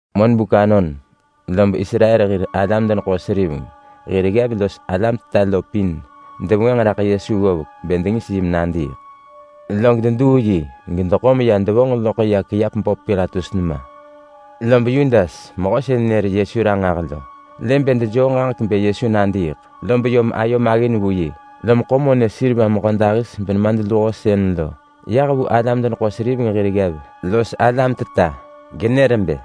Monbuk anon lob Israel hir alam-deneḳo-seriveng hir ggev los alam-teta lo pin devengwënġ raḳ Yesu ggovek bë dengis yi menadiiḳ. Log deduu yi gedeḳo meya devonġ loḳ ya kiap böp Pilatus nema. Lob Yudas, mehö sën nër Yesu ranġah lo, lë bë dejoo ġaġek bë Yesu nadiiḳ, lob yom ayo maggin vu yi, lom ḳo monë seriva mehödahis benemadluho sën lo yah vu alam-deneḳo-seriveng hir ggev los alam-teta, genër bë,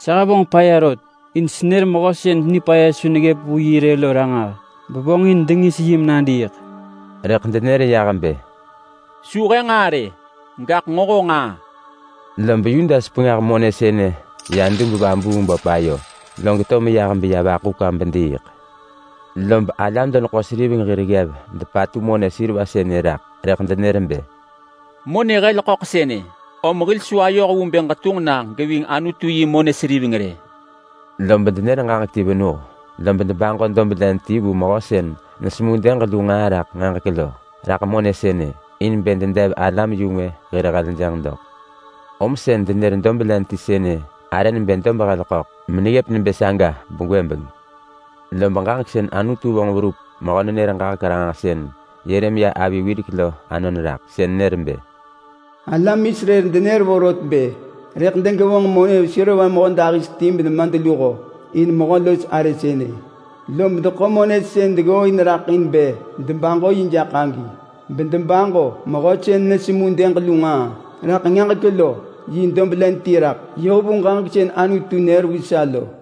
“Sa hevonġ nġaa nipaya! Senër mehö sën nipaya su neggëp vu yi rë lo ranġah, bevonġin dengis yi menadiiḳ.” Rëḳ denër yah bë, “Su he nġaa rë, gaḳ nġo honġ nġaa!” Lob Yudas pengah monë sënë ya dub-vabuung-böp ayo, log to meya vaḳu kwa bediiḳ. Lob alam-deneḳo-seriveng hir ggev depatu monë seriva sënë raḳ, rëḳ denër bë, “Monë hel ḳöḳ sënë, om hil su ayoh vu bë ġetunġ na geving Anutu yi monë seriveng rë!” Lob denër ġaġek ti venuh, lob debaġo dob len ti vu mehö sën nesemu dëg lu nġaa raḳ nġaġek lo raḳ monë sënë, in bë dedev alam-yu-ngwë hir heljënġ doḳ. Om sën denër dob len ti sënë arë nebë Dob-hel-ḳöḳ, meneggëp nebë saga begwëbeng. Lob ġaġek sën Anutu vonġ verup mehö-nenër-ġaġek-ranġahsën Yeremia avi wirek lo anon raḳ. Sën nër bë, “Alam Israel denër vorot bë rëḳ degevonġ monë seriva mehödahis ti benemadluho in mehö los arë sënë, lob deḳo monë sën deggooin raḳ in bë debaġo yi jaḳ agi, bedebaġo mehö sën nesemu dëg lu nġaa raḳ nġaġek lo yi dob len ti raḳ, yoh vu ġaġek sën Anutu nër vu sa lo.”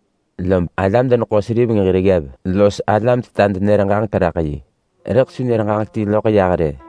Lob alam-deneḳo-seriveng hir ggev los alam-teta denër ġaġek raḳ yi, rëḳ su nër ġaġek ti loḳ yah rë.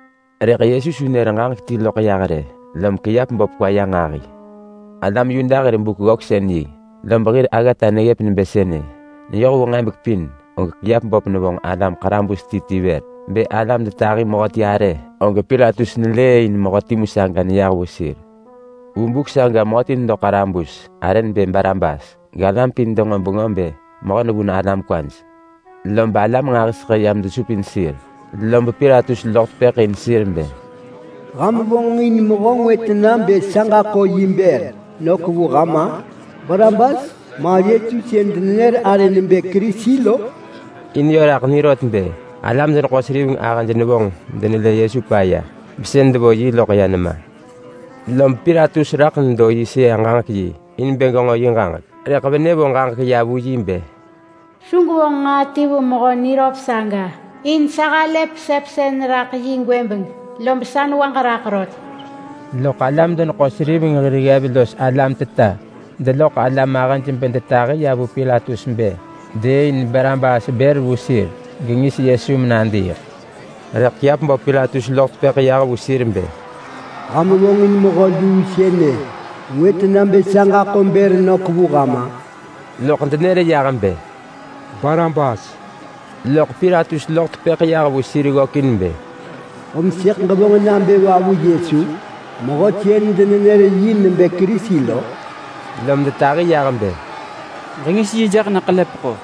Rëḳ Yesu su nër ġaġek ti loḳ yah rë, lom kiap böp kwa ya nġahi. Alam Yuda hir Buk-ggöksën-yi lob hir aggata neggëp nebë sënë: Neyoh vu nġebek pin, og kiap böp nevonġ alam ḳarabus ti ti vër. Bë alam detahi mehöti arë, og Pilatus nelëëin mehö timu saga neyah vu sir. Vu buk saga mehöti nedo ḳarabus, arë nebë Barabas, galam pin denġo bengö bë mehö nevun alam kwaj. Lob alam nġahiseḳë yam desupin sir, lob Pilatus loḳ tepëḳ in sir bë, “Ham vonġin mehö ngwë tena bë sa ġaḳo yi bër nök vu ham-a? Barabas, ma Yesu sën denenër arë nebë Kerisi lo?” In yö raḳ ni rot bë alam-deneḳo-seriveng ahëj nevonġ medenelë Yesu paya, besën devo yi loḳ ya nema. Lob Pilatus raḳ nedo yi sëa-ġaġek-yi in bë genġo yi ġaġek, rëḳ venë vonġ ġaġek ya vu yi bë, “Su gwevonġ nġaa ti vu mehö niröp saga, in sa halë pesepsën raḳ yi gwëbeng, lob sa newaġ raḳ rot.” Loḳ alam-deneḳo-seriveng hir ggev los alam-teta deloḳ alam ahëj bedetahi ya vu Pilatus bë dëëin Barabas bër vu sir gengis Yesu menadiiḳ. Rëḳ kiap böp Pilatus loḳ tepëḳ yah vu sir bë, “Ham vonġin mehö luu sënë ngwë tena bë sa ġaḳo bër nök vu ham-a?” Loḳ denër yah bë, “Barabas!” Rëḳ Pilatus loḳ tepëḳ yah vu sir ggökin bë, “Om sëḳ ġevonġ nabë va vu Yesu, mehö sën denenër yi nebë Kerisi lo?” Lom detahi yah bë, “Ġengis yi jaḳ na ḳelepeḳo!”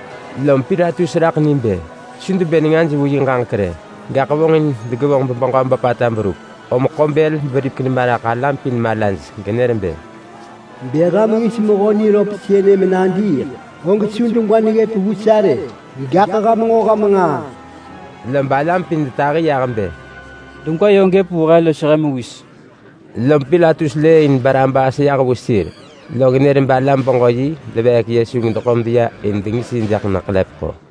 Lom Pilatus raḳ ni bë su debë nengaj vu yi ġaġek rë, gaḳ newaj raḳ gebeġö böpata vonġin berup. Om ḳo bël beripek nema raḳ alam pin malaj genër bë, “Bë ham ngis mehö niröp sënë menadiiḳ, og su degwa neggëp vu sa rë! Gaḳ ham nġo ham nġaa!” Lob alam pin detahi yah bë, “Degwa yö gëp vu he los he mewis!” Lob Pilatus lëëin Barabas yah vu sir. Log nër balam-beġö-yi deveek Yesu gedeḳo medeya in dengis yi jaḳ na ḳelepeḳo.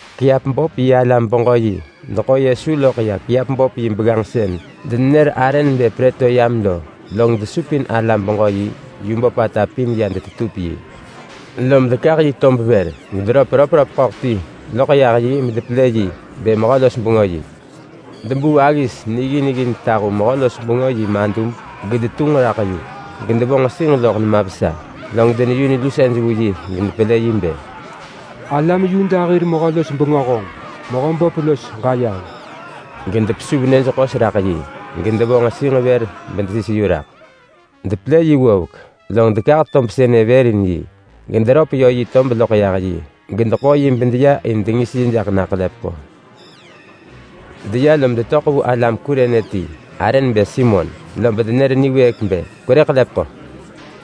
Kiap böp yi alam-beġö-yi deḳo Yesu loḳ ya kiap böp yi begganġ sën denenër arë nebë Prëtoryam lo, log desupin alam-beġö-yi yu böpata pin ya detetup yi. Lob dekah yi tob vër, gederöp röpröp ḳöḳ ti loḳ yah yi medetahu mehö-los-bengö raḳ yi. Debuu aggis niggin ggin tahu alam-los-bengöj hir madub gedetunġ raḳ yu, gedevo nġesinġ loḳ nema vesa, log deneyun lusej vu yi gedepelë yi bë, “Alam Yuda hir mehö-los-bengö honġ, mehö böp los ġayeheng!” Gedepesuv nyëj ḳos raḳ yi, gedevo nġesinġ vër bedesis yu raḳ. Depelë yi ggovek, log dekah tob sënë vër in yi, gederöp yö yi tob loḳ yah yi, gedeḳo yi bedeya in dengis yi jaḳ na ḳelepeḳo. Deya lob detöḳ vu alam Kurene ti, arë nebë Simon. Lob denër niwëëk bë, “Kwerë ḳelepeḳo!”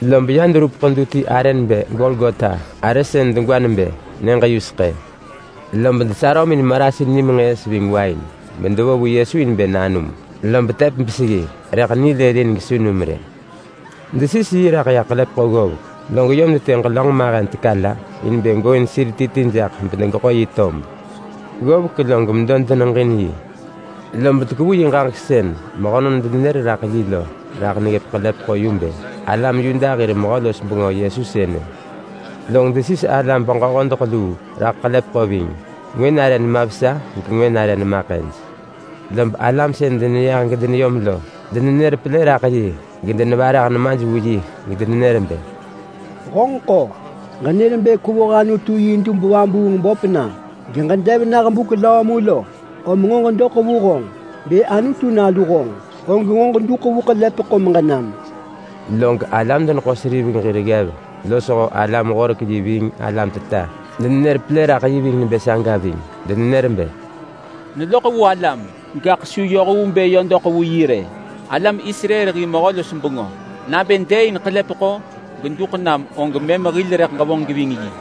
Lob ya deverup ḳedu ti arë nebë Golgota. Arë sën degwa nebë ‘Nyëġ-yuseḳë’. Lob desarömin marasin nimenġëës ving wain bedevo vu Yesu in bë nanum. Lob tep beseggi rëḳ nilëlin gesu num rë. Desis yi raḳ ya ḳelepeḳo ggovek, log yom detë ġelönġ mahen teka la in bë gooin sir ti ti jaḳ bedegeḳo yi tob. Ggovek log medo denemalajin yi. Lob dekevu yi ġaġek sën mehönon denër raḳ yi lo raḳ neggëp ḳelepeḳo yu nebë: ALAM YUDA HIR MEHÖ-LOS-BENGÖ YESU SËNË. Log desis alam-beġö-hodeḳ luu raḳ ḳelepeḳo ving. Ngwë nare ggëp nema vesa gengwë nare ggëp nema ḳëj. Lob alam sën deneyah gedeneyom lo denenër pelë raḳ yi gedenevarah nemaj vu yi gedenenër bë, “Honġeḳ-o! Ġenër bë kwevoh Anutu yi dub-vabuung-böp na, geġedev nah buk löö mu lo, om nġo ġedoḳ vu honġ! Bë Anutu Nalu honġ, og nġo ġeduḳ vu ḳelepeḳo meġenam!” Log alam deneḳo-seriveng hir ggev losho alam-horek-yi ving alam-teta denenër pelë raḳ yi nebë saga ving. Denenër bë, “Neloḳ vu alam, gaḳ su yoh vu bë yö doḳ vu yi rë! Alam Israel hir mehö-los-bengö! Nabë dëëin ḳelepeḳo geduḳ menam, og mëm rëḳ hil ġevonġ geving yi.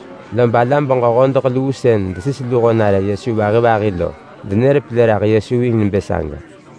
Lob alam-beġö-hodeḳ luu sën desis luho nare Yesu vahi vahi lo denër pelë raḳ Yesu ving nebë saga.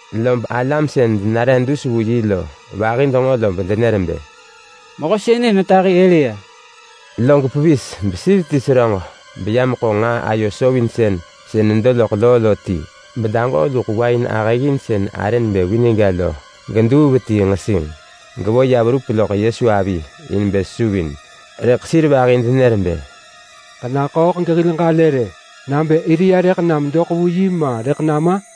Lob alam sën denare dus vu yi lo vahi denġo lob denër bë, “Mehö sënë netahi Elia!” Log pevis besir ti seröġ beya meḳo nġaa ayo sovinsën sën nedo loḳ loo lo ti, bedaġoo luḳ wain ahëggin sën arë nebë vinegga lo geduu ya vetii nġesinġ, gevo ya verup loḳ Yesu avi in bë sesuvin. Rëḳ sir vahi denër bë, “Ġenaḳööḳ gehil ġalë rë, nabë Elia rëḳ nam doḳ vu yi ma rëḳ nama?”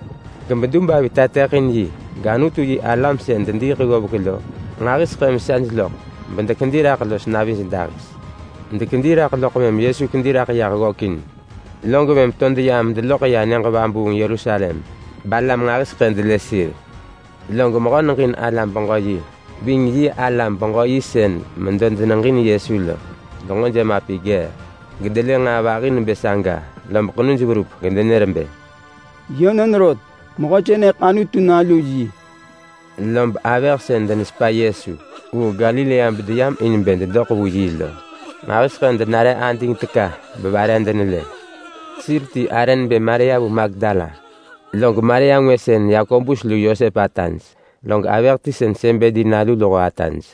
Gebedub avi tateḳin yi gAnutu-yi-alam sën dediiḳ ggovek lo nġahiseḳë vesaj loḳ, bedekedi raḳ los navij dahis. Dekedi raḳ loḳ mëm Yesu kedi raḳ yah ggökin, log mëm to deyam medeloḳ ya nyëġ vabuung Yerusalem. Balam nġahiseḳë delë sir. Log mehö neġin alam-beġö-yi ving yi alam-beġö-yi sën medo deneġin Yesu lo denġo gejemapi ggee, gedelë nġaa vahi nebë saga, lob ḳenuj verup, gedenër bë, “Yönon rot! Mehö sënëḳ Anutu nalu yi!” Lob avëh sën denetamuin Yesu vu Galilea bedeyam in bë dedoḳ vu yi lo nġahiseḳë denare ading teka bevare denelë. Sir ti arë nebë Maria vu Magdala. Log Maria ngwë sën Yakobus lu Yosep ataj. Log avëh ti sën Sebedi nalu luho ataj.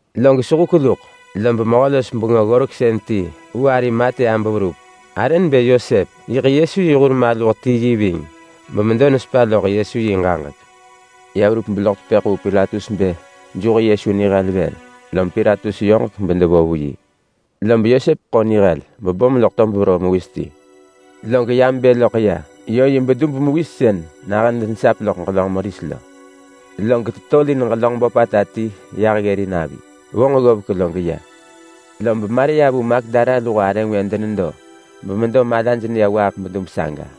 Log sehuk luḳ lob mehö-los-bengö-ggoreksën ti vu Arimatea beverup. Arë nebë Yosep. Yiḳ Yesu yi hur maluh ti yi ving, bemedo nesepa loḳ Yesu yi ġaġek. Ya verup beloḳ tepëḳ vu Pilatus bë geḳo Yesu nihel. Lob Pilatus nër bedevo vu yi. Lob Yosep ḳo nihel bebom loḳ tob veroo mewis ti. Log ya mebë loḳ ya yö yi bedub mewis sën nahën denesap loḳ ġelönġ meris lo. Log tetolin ġelönġ böpata ti ggërin avi. Vonġ ggovek log ya. Lob Maria vu Magdala luho arë ngwë denedo bemedo malaj neya waaḳ bedub saga.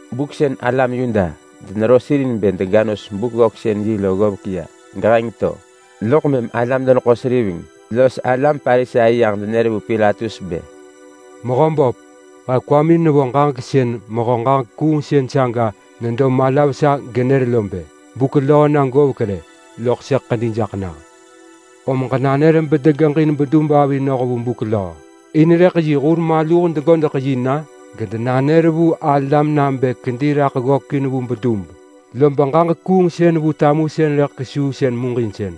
Buk sën alam Yuda denero sir in bë dega nos Buk-ggöksën-yi lo ggovek ya geheng to, loḳ mëm alam-deneḳo-seriveng los alam Parisai yah denër vu Pilatus bë, “Mehö böp! He kwamin nevo ġaġek sën mehö ġaġek kuungsën saga nedo mala vesa genër lo bë, ‘Buk löö na govek rë, loḳ sëḳ ḳedi jaḳ nah!’ Om ġenanër bedegeġin bedub avi noh vu buk löö. In rëḳ yi hur maluh degodeḳ yi na gedenanër vu alam nabë kedi raḳ ggökin vu bedub. Lob ġaġek kuungsën vu tamusën rëḳ kesuu sën muġinsën.”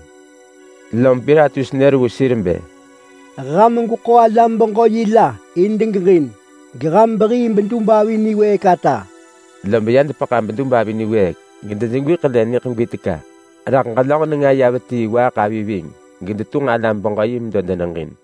Lom Pilatus nër vu sir bë, “Ham gweḳo alam-beġö-yi la in degeġin, beham behii bedub avi niwëëk ata!” Lob ya dekepa bedub avi niwëëk gedejegwi ḳele niḳegwi teka raḳ ġelönġ nenga ya vetii waaḳ avi ving, gedetunġ alam-beġö-yi medo deneġin.